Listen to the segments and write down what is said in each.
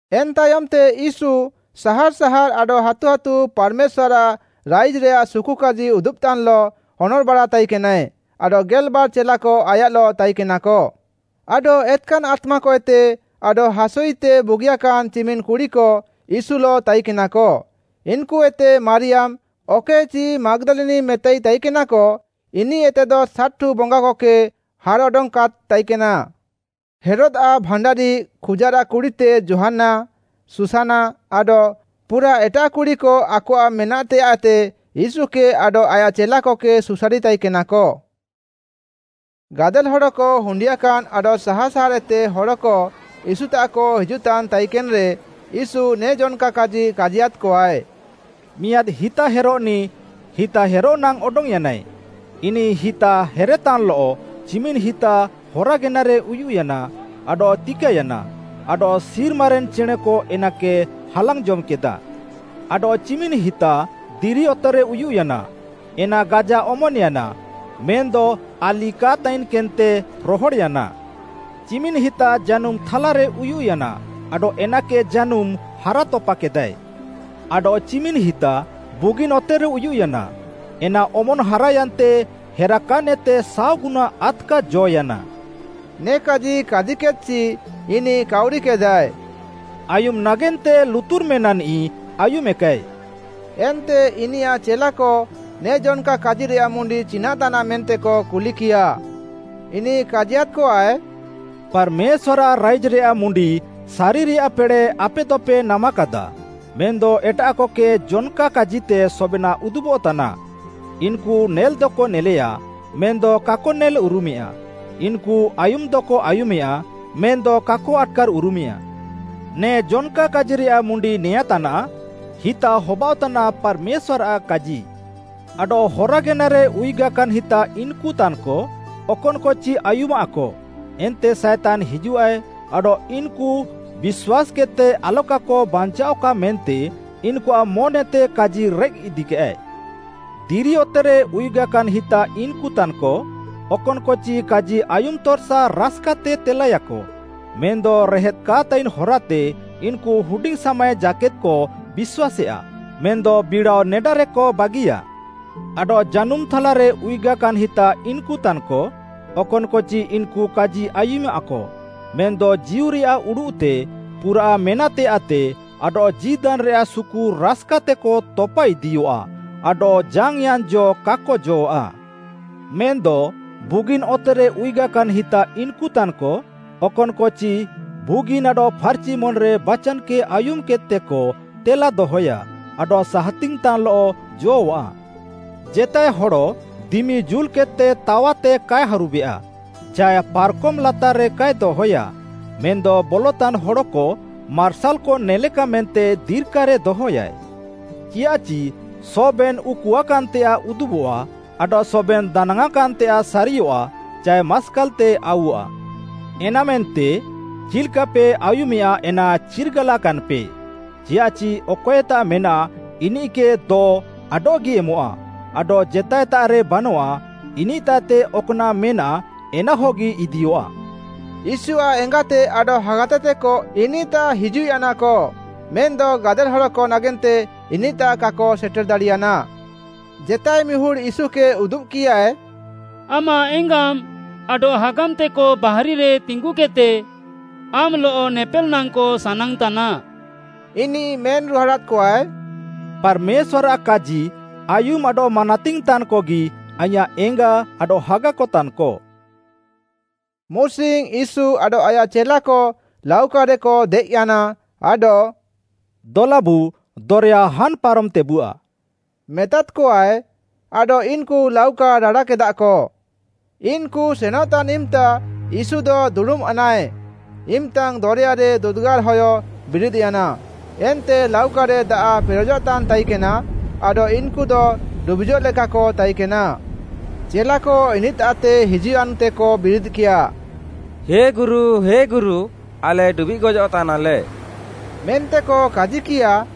ଏନ୍‌ ତାୟମ୍‌ତେ, ୟୀଶୁ ସାହାର୍‌ ସାହାର୍‌ ଆଡଃ ହାତୁ ହାତୁ ପାର୍‌ମେଶ୍ୱାର୍‌ଆଃ ରାଇଜ୍‌ରେୟାଃ ସୁକୁକାଜି ଉଦୁବ୍‌ତାନ୍‌ଲଃ ହନର୍‌ବାଡ଼ା ତାଇକେନାଏ ଆଡଃ ଗେଲ୍‌ବାର୍‌ ଚେଲାକ ଆୟାଃଲଃ ତାଇକେନାକ, ଆଡଃ ଏତ୍‌କାନ୍‌ ଆତ୍ମାକଏତେ ଆଡଃ ହାସୁଇତେ ବୁଗିଆକାନ୍‌ ଚିମିନ୍‌ କୁଡ଼ିକ ୟୀଶୁଲଃ ତାଇକେନାକ, ଇନ୍‌କୁଇତେ ମାରିୟାମ୍‌, ଅକଏକେଚି ମାଗ୍‌ଦାଲିନି ମେତାଇ ତାଇକେନାକ, ଇନିଃଏତେଦ ସାତ୍‌ଠୁ ବଙ୍ଗାକକେ ହାର୍‌ଅଡଙ୍ଗ୍‌କାଦ୍‌ ତାଇକେନା; ହେରୋଦ୍‌ଆଃ ଭାଣ୍ଡାରି ଖୁଜାରାଃ କୁଡ଼ିତେ ଯୋହାନ୍ନା, ଶୁସାନା ଆଡଃ ପୁରାଃ ଏଟାଃ କୁଡ଼ିକ ଆକଆଃ ମେନାଃତେୟାଃତେ ୟୀଶୁକେ ଆଡଃ ଆୟାଃ ଚେଲାକକେ ସୁସାରିତାଇକେନାକ। ଗାଦେଲ୍‌ ହଡ଼କ ହୁଣ୍ଡିୟାକାନ୍ ଆଡଃ ସାହାର୍‌ ସାହାର୍‌ଏତେ ହଡ଼କ ୟୀଶୁତାଃକ ହିଜୁଃତାନ୍‌ ତାଇକେନ୍‌ରେ, ୟୀଶୁ ନେ ଜନ୍‌କା କାଜି କାଜିୟାଦ୍‌କଆଏ। ମିଆଁଦ୍‌ ହିତାହେରଃନିଃ ହିତାହେରଃନାଙ୍ଗ୍‌ ଅଡଙ୍ଗ୍‌ୟାନା। ଇନିଃ ହେର୍‌ହେର୍‌ତାନ୍‌ଲଃ ଚିମିନ୍‌ ହିତା ହରା ଗେନାରେ ଉୟୁଃୟାନା ଆଡଃ ତିକାୟାନା, ଆଡଃ ସିର୍ମାରେନ୍‌ ଚେଣେଁକ ଏନାକେ ହାଲାଙ୍ଗ୍‌ ଜମ୍‌କେଦା। ଆଡଃ ଚିମିନ୍‌ ହିତା ଦିରି ଅତେରେ ଉୟୁଃୟାନା, ଏନା ଗାଜା ଅମନ୍‌ୟାନା, ମେନ୍‌ଦ ହାଲି କା ତାଇକେନ୍‌ତେ ରହଡ଼୍‌ୟାନା। ଚିମିନ୍‌ ହିତା ଜାନୁମ୍‌ ଥାଲାରେ ଉୟୁଃୟାନା ଆଡଃ ଏନାକେ ଜାନୁମ୍‌ ହାରାତପାକେଦାଏ। ଆଡଃ ଚିମିନ୍‌ ହିତା ବୁଗିନ୍‌ ଅତେରେ ଉୟୁଃୟାନା, ଏନା ଅମନ୍‌ ହାରାୟାନ୍ତେ ହେରାକାନ୍‌ଏତେ ସାଅଗୁନା ଆଦ୍‌କା ଜ'ୟାନା। ନେ କାଜି କାଜିକେଦ୍‌ଚି ଇନିଃ କାଉରିକେଦାଏ, “ଆୟୁମ୍‌ ନାଗେନ୍ତେ ଲୁତୁର୍ ମେନାଃନିଃ ଆୟୁମେକାଏ।” ଏନ୍ତେ ଇନିୟାଃ ଚେଲାକ ନେ ଜନ୍‌କା କାଜିରେୟାଃ ମୁଣ୍ଡି ଚିନାଃତାନାଃ ମେନ୍ତେକ କୁଲିକିୟାଃ। ଇନିଃ କାଜିୟାଦ୍‌କଆଏ, “ପାର୍‌ମେଶ୍ୱାର୍‌ଆଃ ରାଇଜ୍‌ରେୟାଃ ମୁଣ୍ଡି ସାରିରେୟାଃ ପେଡ଼େଃ ଆପେଦପେ ନାମାକାଦାଃ ମେନ୍‌ଦ ଏଟାଃକକେ ଜନ୍‌କା କାଜିତେ ସବେନାଃ ଉଦୁବଃତାନା। ଇନ୍‌କୁ ନେଲ୍‌ଦକ ନେଲେୟାଃ, ମେନ୍‌ଦ କାକ ନେଲ୍‌ ଉରୁମେୟାଃ, ଇନ୍‌କୁ ଆୟୁମ୍‌ଦକ ଆୟୁମେୟାଃ, ମେନ୍‌ଦ କାକ ଆଟ୍‌କାର୍ ଉରୁମେୟାଃ। “ନେ ଜନ୍‌କା କାଜିରେୟାଃ ମୁଣ୍ଡି ନେଆଁଁତାନାଃ, ହିତା ହବାଅଃତାନା ପାର୍‌ମେଶ୍ୱାର୍‌ଆଃ କାଜି। ଆଡଃ ହରା ଗେନାରେ ଉୟୁଗାକାନ୍‌ ହିତା ଇନ୍‌କୁତାନ୍‌କ, ଅକନ୍‌କଚି ଆୟୁମାଃକ, ଏନ୍ତେ ସାଏତାନ୍‌ ହିଜୁଃଆଏ ଆଡଃ ଇନ୍‌କୁ ବିଶ୍ୱାସ୍‌କେଦ୍‌ତେ ଆଲକାକ ବାଞ୍ଚାଅଃକା ମେନ୍ତେ ଇନ୍‌କୁଆଃ ମନ୍‌ଏତେ କାଜି ରେଃକ୍‌ ଇଦିୟାଏ। ଦିରି ଅତେରେ ଉୟୁଗାକାନ୍‌ ହିତା ଇନ୍‌କୁତାନ୍‌କ, ଅକନ୍‌କଚି କାଜି ଆୟୁମ୍‌ତର୍‌ସା ରାସ୍‌କାତେ ତେଲାୟାକ, ମେନ୍‌ଦ ରେହେଦ୍‌ କା ତାଇନ୍‌ ହରାତେ ଇନ୍‌କୁ ହୁଡିଙ୍ଗ୍‌ ସାମାଏ ଜାକେଦ୍‌କ ବିଶ୍ୱାସେୟାଃ, ମେନ୍‌ଦ ବିଡ଼ାଅ ନେଡାରେକ ବାଗିୟା। ଆଡଃ ଜାନୁମ୍‌ ଥାଲାରେ ଉୟୁଗାକାନ୍‌ ହିତା ଇନ୍‌କୁତାନ୍‌କ, ଅକନ୍‌କଚି ଇନ୍‌କୁ କାଜି ଆୟୁମାଃକ, ମେନ୍‌ଦ ଜୀଉରେୟାଃ ଉଡ଼ୁଃତେ, ପୁରାଃ ମେନାଃତେୟାଃତେ, ଆଡଃ ଜୀନିଦ୍‌ରେୟାଃ ସୁକୁ ରାସ୍‌କାତେକ ତପା ଇଦିୟଃଆ ଆଡଃ ଜାଙ୍ଗ୍‌ୟାଁନ୍‌ ଜ କାକ ଜ'ଅଃଆ। ମେନ୍‌ଦ ବୁଗିନ୍‌ ଅତେରେ ଉୟୁଗାକାନ୍‌ ହିତା ଇନ୍‌କୁତାନ୍‌କ, ଅକନ୍‌କଚି ବୁଗିନ୍‌ ଆଡଃ ଫାର୍‌ଚି ମନ୍‌ରେ ବାଚାନ୍‌କେ ଆୟୁମ୍‌କେଦ୍‌ତେକ ତେଲାଦହୟା ଆଡଃ ସାହାତିଙ୍ଗ୍‌ତାନ୍‌ଲଃକ ଜ'ଅଃଆ। “ଜେତାଏ ହଡ଼ ଦିମି ଜୁଲ୍‌କେଦ୍‌ତେ ତାୱାତେ କାଏ ହାରୁବେୟା, ଚାଏ ପାର୍‌କମ୍‌ ଲାତାର୍‌ରେ କାଏ ଦହୟାଃ, ମେନ୍‌ଦ ବଲତାନ୍‌ ହଡ଼କ ମାର୍ସାଲ୍‌କ ନେଲେକା ମେନ୍ତେ ଦିର୍କାରେ ଦହୟାଃ। “ଚିୟାଃଚି ସବେନ୍‌ ଉକୁଆକାନ୍‌ତେୟାଃ ଉଦୁବଃଆ ଆଡଃ ସବେନ୍‌ ଦାନାଙ୍ଗ୍‌ଆଁକାନ୍‌ତେୟାଃ ସାରିଅଃଆ ଚାଏ ମାସ୍କାଲ୍‌ତେ ଆଉଅଃଆ। “ଏନାମେନ୍ତେ, ଚିଲ୍‌କାପେ ଆୟୁମେୟାଃ ଏନା ଚିର୍ଗାଲାକାନ୍‌ପେ, ଚିୟାଃଚି ଅକଏତାଃ ମେନାଃ ଇନିଃକେ ଦ ଆଡଃଗି ଏମଃଆ, ଆଡଃ ଜେତାଏତାଃରେ ବାନଃଆ, ଇନିଃତାଃଏତେ ଅକ୍‌ନାଃ ମେନାଃ ଏନାହଗି ଇଦିୟଃଆ।” ୟୀଶୁଆଃ ଏଙ୍ଗାତେ ଆଡଃ ହାଗାତେ ତେକ ଇନିଃତାଃ ହିଜୁଃୟାନାକ ମେନ୍‌ଦ ଗାଦେଲ୍‌ ହଡ଼କ ନାଗେନ୍ତେ ଇନିଃତାଃ କାକ ସେଟେର୍‌ ଦାଡ଼ିୟାନା। ଜେତାଏ ମିହୁଡ଼୍‌ ୟୀଶୁକେ ଉଦୁବ୍‌କିୟାଏ, “ଆମାଃ ଏଙ୍ଗାମ୍‌ ଆଡଃ ହାଗାମ୍‌ତେକ ବାହାରିରେ ତିଙ୍ଗୁକେଦ୍‌ତେ ଆମ୍‌ଲଃ ନେପେଲ୍‌ ନାଙ୍ଗ୍‌କ ସାନାଙ୍ଗ୍‌ତାନା।” ଇନିଃ ମେନ୍‌ରୁହାଡ଼ାଦ୍‌କଆଏ, “ପାର୍‌ମେଶ୍ୱାର୍‌ଆଃ କାଜି ଆୟୁମ୍‌ ଆଡଃ ମାନାତିଙ୍ଗ୍‌ ତାନ୍‌କଗି ଆଇଁୟାଃ ଏଙ୍ଗା ଆଡଃ ହାଗାକ ତାନ୍‌କ।” ମୁସିଙ୍ଗ୍‌ ୟୀଶୁ ଆଡଃ ଆୟାଃ ଚେଲାକ ଲାଉକାରେକ ଦେଏଃୟାନା ଆଡଃ “ଦଲାବୁ ଦରେୟା ହାନ୍‌ ପାରମ୍‌ତେବୁଆ” ମେତାଦ୍‌କଆଏ। ଆଡଃ ଇନ୍‌କୁ ଲାଉକା ରାଡ଼ାକେଦାଃକ ଇନ୍‌କୁ ସେନଃତାନ୍‌ ଇମ୍‌ତା ୟୀଶୁଦ ଦୁଡ଼ୁମ୍‌ୟାନାଏ। ଇମ୍‌ତାଙ୍ଗ୍‌ ଦରେୟାରେ ଦୁଦୁଗାର୍‌ହୟ ବିରିଦ୍‌ୟାନା, ଏନ୍ତେ ଲାଉକାରେ ଦାଆଃ ପେରେଜଃତାନ୍‌ ତାଇକେନା, ଆଡଃ ଇନ୍‌କୁଦ ଡୁବିଜଃଲେକାକ ତାଇକେନା। ଚେଲାକ ଇନିଃତାଃତେ ହିଜୁଃୟାନ୍‌ତେକ ବିରିଦ୍‌କିୟା, “ହେ ଗୁରୁ, ହେ ଗୁରୁ, ଆଲେ ଡୁବିଃଗ୍‌ ଗଜଃତାନାଲେ” ମେନ୍ତେକ କାଜିକିୟାଃ।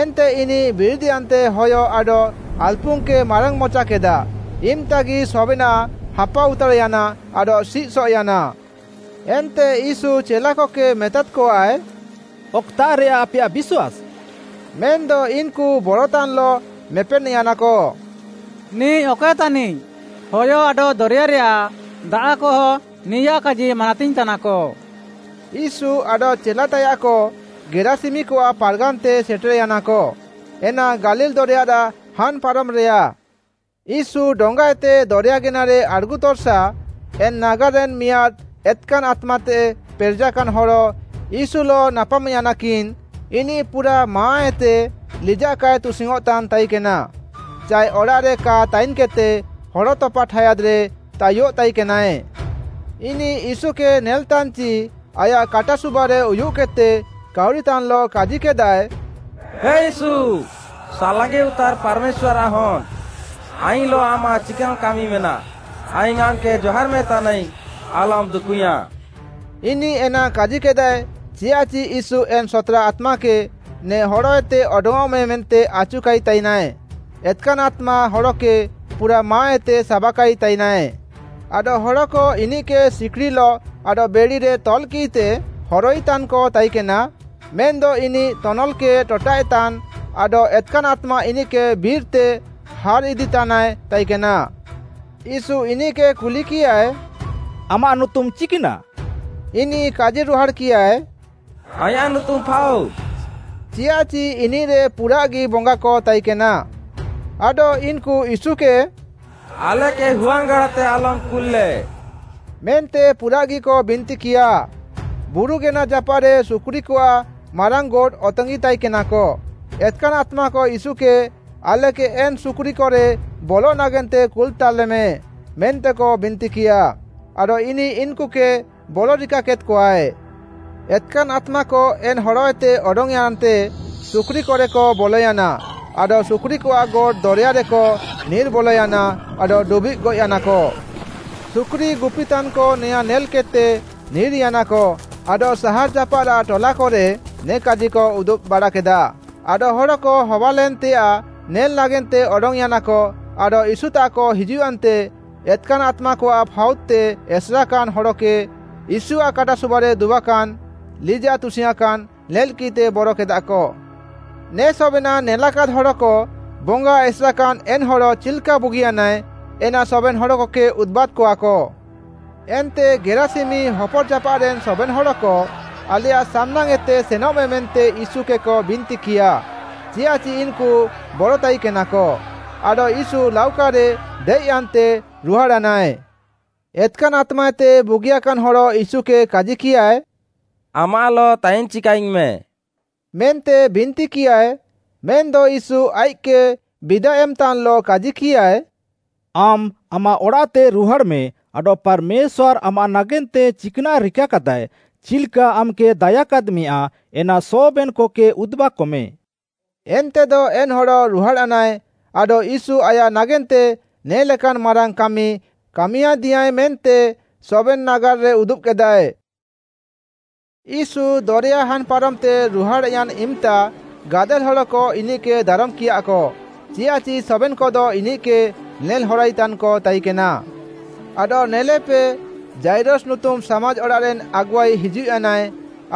ଏନ୍ତେ ଇନିଃ ବିରିଦ୍‌ୟାନ୍ତେ ହୟ ଆଡଃ ଆଲ୍‌ପୁଙ୍ଗ୍‌କେ ମାରାଙ୍ଗ୍‌ମଚାକେଦାଃ, ଇମ୍‌ତାଙ୍ଗ୍‌ଗି ସବେନାଃ ହାପାଉତାର୍‌ୟାନା ଆଡଃ ସିଃସଏଃୟାନା। ଏନ୍ତେ ୟୀଶୁ ଚେଲାକକେ ମେତାଦ୍‌କଆଏ, “ଅକ୍‌ତାଃରେୟା ଆପେୟାଃ ବିଶ୍ୱାସ୍‌?” ମେନ୍‌ଦ ଇନ୍‌କୁ ବରତାନ୍‌ଲଃ ମେପେନ୍‌ୟାନାକ, “ନିଃ ଅକଏ ତାନିଃ, ହୟ ଆଡଃ ଦରେୟାରେୟାଃ ଦାଆଃକହ ନିୟାଃ କାଜି ମାନାତିଙ୍ଗ୍‌ ତାନାକ।” ୟୀଶୁ ଆଡଃ ଚେଲାତାୟାଃକ ଗେରାସିମିକଆଃ ପାର୍‌ଗାନ୍‌ତେ ସେଟେର୍‌ୟାନାକ, ଏନା ଗାଲିଲ୍‌ ଦରେୟାରାଃ ହାନ୍‌ ପାରମ୍‌ରେୟା। ୟୀଶୁ ଡଙ୍ଗାଏତେ ଦରେୟା ଗେନାରେ ଆଡ଼୍‌ଗୁତର୍‌ସା, ଏନ୍‌ ନାଗାର୍‌ରେନ୍ ମିହୁଡ଼୍‌ ଏତ୍‌କାନ୍‌ ଆତ୍ମାଏତେ ପେରେଜାକାନ୍‌ ହଡ଼ ୟୀଶୁଲଃ ନାପାମ୍‌ୟାନାକିନ୍, ଇନିଃ ପୁରାଃ ମାହାଁଏତେ ଲିଜାଃ କାଏ ତୁସିଙ୍ଗ୍‌ଅଁତାନ୍‌ ତାଇକେନା ଚାଏ ଅଡ଼ାଃରେ କା ତାଇନ୍‌କେଦ୍‌ତେ ହଡ଼ ତପା ଠାୟାଦ୍‌ରେ ତାୟୁଃତାଇକେନାଏ। ଇନିଃ ୟୀଶୁକେ ନେଲ୍‌ତାନ୍‌ଚି ଆୟାଃ କାଟାସୁବାରେ ଉୟୁଃକେଦ୍‌ତେ କାଉରିତାନ୍‌ଲଃ କାଜିକେଦାଏ, “ହେ ୟୀଶୁ ସାଲାଙ୍ଗିଉତାର୍ ପାର୍‌ମେଶ୍ୱାର୍‌ଆଃ ହନ୍‌, ଆଇଙ୍ଗ୍‌ଲଃ ଆମାଃ ଚିକାନ୍‌ କାମି ମେନାଃ? ଆଇଙ୍ଗ୍‌ ଆମ୍‌କେ ଜହାର୍ ମେଁ ତାନାଇଙ୍ଗ୍‌ ଆଲମ୍‌ ଦୁକୁଇୟାଁଃ!” ଇନିଃ ଏନା କାଜିକେଦାଏ ଚିୟାଃଚି ୟୀଶୁ ଏନ୍‌ ସତ୍‌ରା ଆତ୍ମାକେ ନେ ହଡ଼ଏତେ ଅଡଙ୍ଗ୍‌ଅଃମେ ମେନ୍ତେ ଆଚୁକାଇତାଇନାଏ। ଏତ୍‌କାନ୍‌ ଆତ୍ମା ହଡ଼କେ ପୁରାଃ ମାହାଁଏତେ ସାବାକାଇତାଇନାଏ। ଆଡଃ ହଡ଼କ ଇନିଃକେ ସିକ୍‌ଡ଼ିଲଃ ଆଡଃ ବେଢ଼ିରେ ତଲ୍‌କିଃତେ ହରଇତାନ୍‌କ ତାଇକେନା, ମେନ୍‌ଦ ଇନିଃ ତନଲ୍‌କେ ଟଟାଃଏତାନ୍‌ ଆଡଃ ଏତ୍‌କାନ୍‌ ଆତ୍ମା ଇନିଃକେ ବିର୍‌ତେ ହାର୍‌ଇଦିତାନାଏ ତାଇକେନା। ୟୀଶୁ ଇନିଃକେ କୁଲିକିୟାଏ “ଆମାଃ ନୁତୁମ୍‌ ଚିକ୍‌ନାଃ?” ଇନିଃ କାଜିରୁହାଡ଼୍‌କିୟାଏ, “ଆଇଁୟାଃ ନୁତୁମ୍‌ ଫାଉଦ୍,” ଚିୟାଃଚି ଇନିଃରେ ପୁରାଃଗି ବଙ୍ଗାକ ତାଇକେନା। ଆଡଃ ଇନ୍‌କୁ ୟୀଶୁକେ “ଆଲେକେ ହୁଆଙ୍ଗ୍‌ଗାଡ଼ାତେ ଆଲମ୍‌ କୁଲ୍‌ଲେ” ମେନ୍ତେ ପୁରାଃଗିକ ବିନ୍ତିକିୟାଃ। ବୁରୁଗେନା ଜାପାଃରେ ସୁକୁରିକଆଃ ମାରାଙ୍ଗ୍‌ ଗୋଟ୍‌ ଆତିଙ୍ଗ୍‌ତାଇକେନାକ। ଏତ୍‌କାନ୍‌ ଆତ୍ମାକ ୟୀଶୁକେ, ଆଲେକେ ଏନ୍‌ ସୁକୁରିକରେ ବଲଃ ନାଗେନ୍ତେ କୁଲ୍‌ତାଲେମେ ମେନ୍ତେକ ବିନ୍ତିକିୟାଃ, ଆଡଃ ଇନିଃ ଇନ୍‌କୁକେ ବଲରିକାକେଦ୍‌କଆଏ। ଏତ୍‌କାନ୍‌ ଆତ୍ମାକ ଏନ୍‌ ହଡ଼ଏତେ ଅଡଙ୍ଗ୍‌ୟାନ୍‌ତେ ସୁକୁରିକରେକ ବଲୟାନା ଆଡଃ ସୁକୁରିକଆଃ ଗୋଟ୍‌ ଦରେୟାରେକ ନିର୍‌ବଲୟାନା ଆଡଃ ଡୁବିଃଗ୍‌ ଗଏଃୟାନାକ। ସୁକୁରି ଗୁପିତାନ୍‌କ ନେଆଁଁ ନେଲ୍‌କେଦ୍‌ତେ ନିର୍‌ୟାନାକ ଆଡଃ ସାହାର୍ ଜାପାଃରାଃ ଟଲାକରେ ନେ କାଜିକ ଉଦୁବ୍‌ ବାଡ଼ାକେଦାଃ, ଆଡଃ ହଡ଼କ ହବାଲେନ୍‌ତେୟାଃ ନେଲ୍‌ନାଗେନ୍ତେ ଅଡଙ୍ଗ୍‌ୟାନାକ ଆଡଃ ୟୀଶୁତାଃକ ହିଜୁଃୟାନ୍ତେ ଏତ୍‌କାନ୍‌ ଆତ୍ମାକଆଃ ଫାଉଦ୍‌ତେ ଏସେରାକାନ୍‌ ହଡ଼କେ ୟୀଶୁଆଃ କାଟାସୁବାରେ ଦୁବାକାନ୍‌, ଲିଜାଃ ତୁସିଙ୍ଗ୍‌ଆଁକାନ୍‌ ନେଲ୍‌କିଃତେ ବରକେଦାଃକ। ନେ ସବେନାଃ ନେଲାକାଦ୍ ହଡ଼କ ବଙ୍ଗା ଏସେର୍‌କାନ୍‌ ଏନ୍‌ ହଡ଼ ଚିଲ୍‌କା ବୁଗିୟାନାଏ, ଏନା ସବେନ୍‌ ହଡ଼କକେ ଉଦୁବାଦ୍‌କଆକ। ଏନ୍ତେ ଗେରାସିମି ହପର୍‌ଜାପାଃରେନ୍‌ ସବେନ୍‌ ହଡ଼କ ଆଲେୟାଃ ସାମ୍‌ନାଙ୍ଗ୍‌ଏତେ ସେନଃମେ ମେନ୍ତେ ୟୀଶୁକେକ ବିନ୍ତିକିୟା, ଚିୟାଃଚି ଇନ୍‌କୁ ବରତାଇକେନାକ। ଆଡଃ ୟୀଶୁ ଲାଉକାରେ ଦେଏଃୟାନ୍ତେ ରୁହାଡ଼୍‌ୟାନାଏ। ଏତ୍‌କାନ୍‌ ଆତ୍ମାଏତେ ବୁଗିୟାକାନ୍ ହଡ଼ ୟୀଶୁକେ କାଜିକିୟାଏ, “ଆମାଃଲଃ ତାଇନ୍‌ ଚିକାଆଇଙ୍ଗ୍‌ମେଁ” ମେନ୍ତେ ବିନ୍ତିକିୟାଏ, ମେନ୍‌ଦ ୟୀଶୁ ଆଇଃକ୍‌କେ ବିଦା ଏମ୍‌ତାନ୍‌ଲଃ କାଜିକିୟାଏ, “ଆମ୍‌ ଆମାଃ ଅଡ଼ାଃତେ ରୁହାଡ଼୍‌ମେଁ ଆଡଃ ପାର୍‌ମେଶ୍ୱାର୍‌ ଆମାଃ ନାଗେନ୍ତେ ଚିକ୍‌ନାଃ ରିକାକାଦାୟ, ଚିଲ୍‌କା ଆମ୍‌କେ ଦାୟାକାଦ୍‌ମେୟା ଏନା ସବେନ୍‌କକେ ଉଦୁବାକମେ।” ଏନ୍ତେଦ ଏନ୍‌ ହଡ଼ ରୁହାଡ଼୍‌ୟାନାଏ, ଆଡଃ ୟୀଶୁ ଆୟାଃ ନାଗେନ୍ତେ ନେ'ଲେକାନ୍‌ ମାରାଙ୍ଗ୍‌ କାମି କାମିୟାଁଦିୟାଁଏ ମେନ୍ତେ ସବେନ୍‌ ନାଗାର୍‌ରେ ଉଦୁବ୍‌କେଦାଏ। ୟୀଶୁ ଦରେୟା ହାନ୍‌ପାରମ୍‌ତେ ରୁହାଡ଼୍‌ୟାନ୍‌ ଇମ୍‌ତା ଗାଦେଲ୍‌ ହଡ଼କ ଇନିଃକେ ଦାରମ୍‌କିୟାଃକ, ଚିୟାଃଚି ସବେନ୍‌କଦ ଇନିଃକେ ନେଲ୍‌ହରାଇତାନ୍‌କ ତାଇକେନା। ଆଡଃ ନେଲେପେ, ଯାଇରସ ନୁତୁମ୍‌ ସାମାଜ୍‌ ଅଡ଼ାଃରେନ୍‌ ଆଗୁଆଇ ହିଜୁଃୟାନାଏ,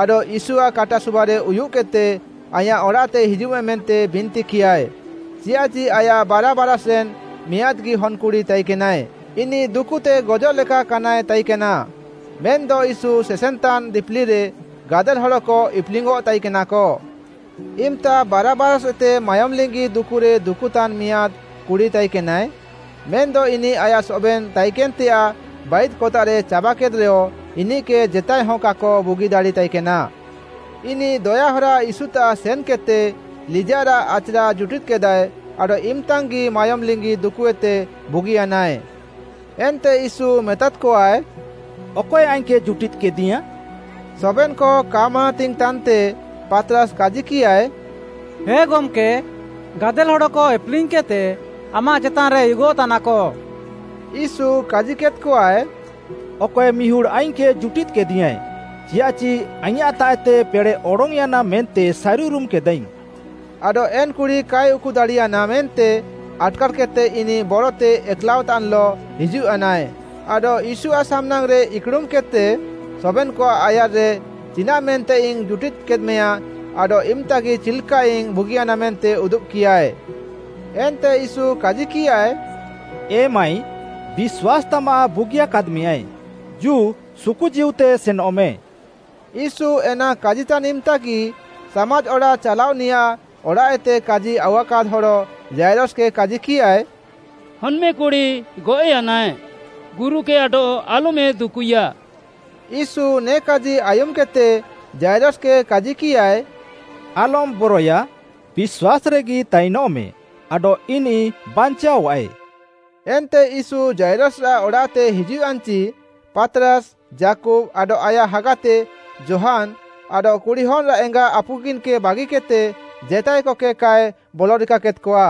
ଆଡଃ ୟୀଶୁଆଃ କାଟା ସୁବାରେ ଉୟୁଃକେଦ୍‌ତେ ଆଇଁୟାଃ ଅଡ଼ାଃତେ ହିଜୁଃମେ ମେନ୍ତେ ବିନ୍ତିକିୟାଏ, ଚିୟାଃଚି ଆୟାଃ ବାରା ବାରାଷ୍‌ରେନ୍‌ ମିଆଁଦ୍‌ଗି ହନ୍‌କୁଡ଼ି ତାଇକେନାଏ, ଇନିଃ ଦୁକୁତେ ଗଜଃଲେକା କାନାଏ ତାଇକେନା। ମେନ୍‌ଦ ୟୀଶୁ ସେସେନ୍‌ତାନ୍ ଦିପିଲିରେ ଗାଦେଲ୍‌ ହଡ଼କ ଇପ୍‌ଲିଙ୍ଗ୍‌ଅଃ ତାଇକେନାକ। ଇମ୍‌ତା ବାରା ବାରାଷ୍‌ଏତେ ମାୟୋମ୍‌ଲିଙ୍ଗି ଦୁକୁରେ ଦୁକୁତାନ୍‌ ମିଆଁଦ୍‌ କୁଡ଼ି ତାଇକେନାଏ, ମେନ୍‌ଦ ଇନିଃ ଆୟାଃ ସବେନ୍‌ ତାଇକେନ୍‌ତେୟାଃ ବାଇଦ୍‌କତାଃରେ ଚାବାକେଦ୍‌ରେୟ ଇନିଃକେ ଜେତାଏ ହ କାକ ବୁଗି ଦାଡ଼ି ତାଇକେନା। ଇନିଃ ଦୟାହରା ୟୀଶୁତାଃ ସେନ୍‌କେଦ୍‌ତେ ଲିଜାଃରାଃ ଆଚ୍‌ରା ଜୁଟିଦ୍‌କେଦାଏ, ଆଡଃ ଇମ୍‌ତାଙ୍ଗ୍‌ଗି ମାୟୋମ୍‌ ଲିଙ୍ଗି ଦୁକୁଏତେ ବୁଗିୟାନାଏ। ଏନ୍ତେ ୟୀଶୁ ମେତାଦ୍‌କଆଏ, “ଅକଏ ଆଇଙ୍ଗ୍‌କେ ଜୁଟିଦ୍‌କିଦିୟାଏଁ?” ସବେନ୍‌କ କା ମାନାତିଙ୍ଗ୍‌ ତାନ୍‌ତେ, ପାତ୍‌ରାସ୍‌ କାଜିକିୟାଏ “ହେ ଗମ୍‌କେ, ଗାଦେଲ୍‌ ହଡ଼କ ଇପ୍‌ଲିଙ୍ଗ୍‌କେଦ୍‌ତେ ଆମାଃ ଚେତାନ୍‌ରେ ଉୟୁଗଃତାନାକ।” ୟୀଶୁ କାଜିକେଦ୍‌କଆଏ, “ଅକଏ ମିହୁଡ଼୍‌ ଆଇଙ୍ଗ୍‌କେ ଜୁଟିଦ୍ କେଦିଙ୍ଗ୍‌ଆଏ, ଚିୟାଃଚି ଆଇଙ୍ଗ୍‌ତାଃଏତେ ପେଡ଼େଃ ଅଡଙ୍ଗ୍‌ୟାନା ମେନ୍ତେ ସାରିଉରୁମ୍‌ କେଦାଆଇଙ୍ଗ୍‌।” ଆଡଃ ଏନ୍‌କୁଡ଼ି କାଏ ଉକୁଦାଡ଼ିୟାନା ମେନ୍ତେ ଆଟ୍‌କାର୍‌କେଦ୍‌ତେ ଇନିଃ ବରତେ ଏକ୍‌ଲାଅଃତାନ୍‌ଲଃ ହିଜୁଃୟାନାଏ ଆଡଃ ୟୀଶୁଆଃ ସାମ୍‌ନାଙ୍ଗ୍‌ରେ ଇକ୍‌ଡ଼ୁମ୍‌କେଦ୍‌ତେ ସବେନ୍‌କଆଃ ଆୟାର୍‌ରେ, ଚିନାଃମେନ୍ତେଇଙ୍ଗ୍‌ ଜୁଟିଦ୍‌କେଦ୍‌ମେୟାଁ ଆଡଃ ଇମ୍‌ତାଗି ଚିଲ୍‌କାଇଙ୍ଗ୍‌ ବୁଗିୟାନା ମେନ୍ତେ ଉଦୁବ୍‌କିୟାଏ। ଏନ୍ତେ ୟୀଶୁ କାଜିକିୟାଏ, “ଏ ମାଈ, ବିଶ୍ୱାସ୍‌ ତାମାଃ ବୁଗିୟାକାଦ୍‌ମେଁୟାଏ, ଜୁ ସୁକୁ ଜୀଉତେ ସେନଃମେ।” ୟୀଶୁ ଏନା କାଜିତାନ୍‌ ଇମ୍‌ତାଗି, ସାମାଜ୍‌ ଅଡ଼ାଃ ଚାଲାଅନିୟାଃ ଅଡ଼ାଃଏତେ କାଜି ଆଉୱାକାଦ୍‌ ହଡ଼ ଯାଇରସକେ କାଜିକିୟାଏ, “ହନ୍‌ମେକୁଡ଼ି ଗଏଃୟାନାଏ, ଗୁରୁକେ ଆଡଃ ଆଲ୍‌ମେ ଦୁକୁଇୟା।” ୟୀଶୁ ନେ କାଜି ଆୟୁମ୍‌କେଦ୍‌ତେ ଯାଇରସକେ କାଜିକିୟାଏ, “ଆଲମ୍‌ ବରଏୟା, ବିଶ୍ୱାସ୍‌ରେଗି ତାଇନଃମେ, ଆଡଃ ଇନିଃ ବାଞ୍ଚାଅଃଆଏ।” ଏନ୍ତେ ୟୀଶୁ ଯାଇରସରାଃ ଅଡ଼ାଃତେ ହିଜୁଃୟାନ୍‌ଚି, ପାତ୍‌ରାସ୍‌, ଯାକୁବ୍‌, ଆଡଃ ଆୟାଃ ହାଗାତେ ଯୋହାନ୍‌ ଆଡଃ କୁଡ଼ିହନ୍‌ଆଃ ଏଙ୍ଗା ଆପୁକିନ୍‌କେ ବାଗିକେଦ୍‌ତେ ଜେତାଏକକେ କାଏ ବଲରିକାକେଦ୍‌କଆ।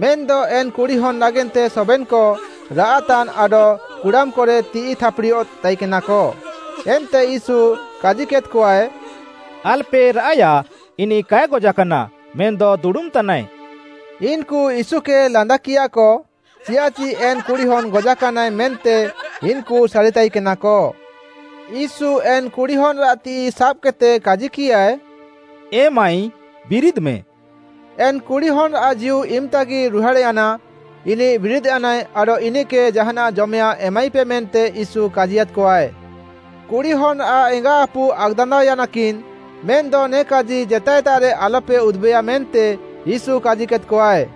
ମେନ୍‌ଦ ଏନ୍‌ କୁଡ଼ିହନ୍ ନାଗେନ୍ତେ ସବେନ୍‌କ ରାଆଃତାନ୍ ଆଡଃ କୁଡ଼ାମ୍‌କରେ ତିଃଇ ଥାପ୍‌ଡ଼ିଅଃତାଇକେନାକ। ଏନ୍ତେ ୟୀଶୁ କାଜିକେଦ୍‌କଆଏ, ଆଲ୍‌ପେ ରାଆଃଏୟା ଇନିଃ କାଏ ଗଜାକାନା ମେନ୍‌ଦ ଦୁଡ଼ୁମ୍‌ତାନାଏ। ଇନ୍‌କୁ ୟୀଶୁକେ ଲାନ୍ଦାକିୟାଃକ ଚିୟାଃଚି ଏନ୍‌ କୁଡ଼ିହନ୍ ଗଜାକାନାଏ ମେନ୍ତେ ଇନ୍‌କୁ ସାରିତାଇକେନାକ। ୟୀଶୁ ଏନ୍‌ କୁଡ଼ିହନ୍‌ଆଃ ତିଃଇ ସାବ୍‌କେଦ୍‌ତେ କାଜିକିୟାଏ, “ଏ ମାଈ ବିରିଦ୍‌ମେ।” ଏନ୍‌ କୁଡ଼ିହନ୍‌ଆଃ ଜୀଉ ଇମ୍‌ତାଗି ରୁହାଡ଼୍‌ୟାନା, ଇନିଃ ବିରିଦ୍‌ୟାନାଏ ଆଡଃ ଇନିଃକେ ଜାହାନାଃ ଜମେୟାଃଁ ଏମାଇପେ ମେନ୍ତେ ୟୀଶୁ କାଜିୟାଦ୍‌କଆଏ। କୁଡ଼ିହନ୍‌ଆଃ ଏଙ୍ଗା ଆପୁ ଆକ୍‌ଦାନ୍ଦାଅୟାନାକିନ୍ ମେନ୍‌ଦ ନେ କାଜି ଜେତାଏତାଃରେ ଆଲ୍‌ପେ ଉଦୁବେୟା ମେନ୍ତେ ୟୀଶୁ କାଜିକେଦ୍‌କଆଏ।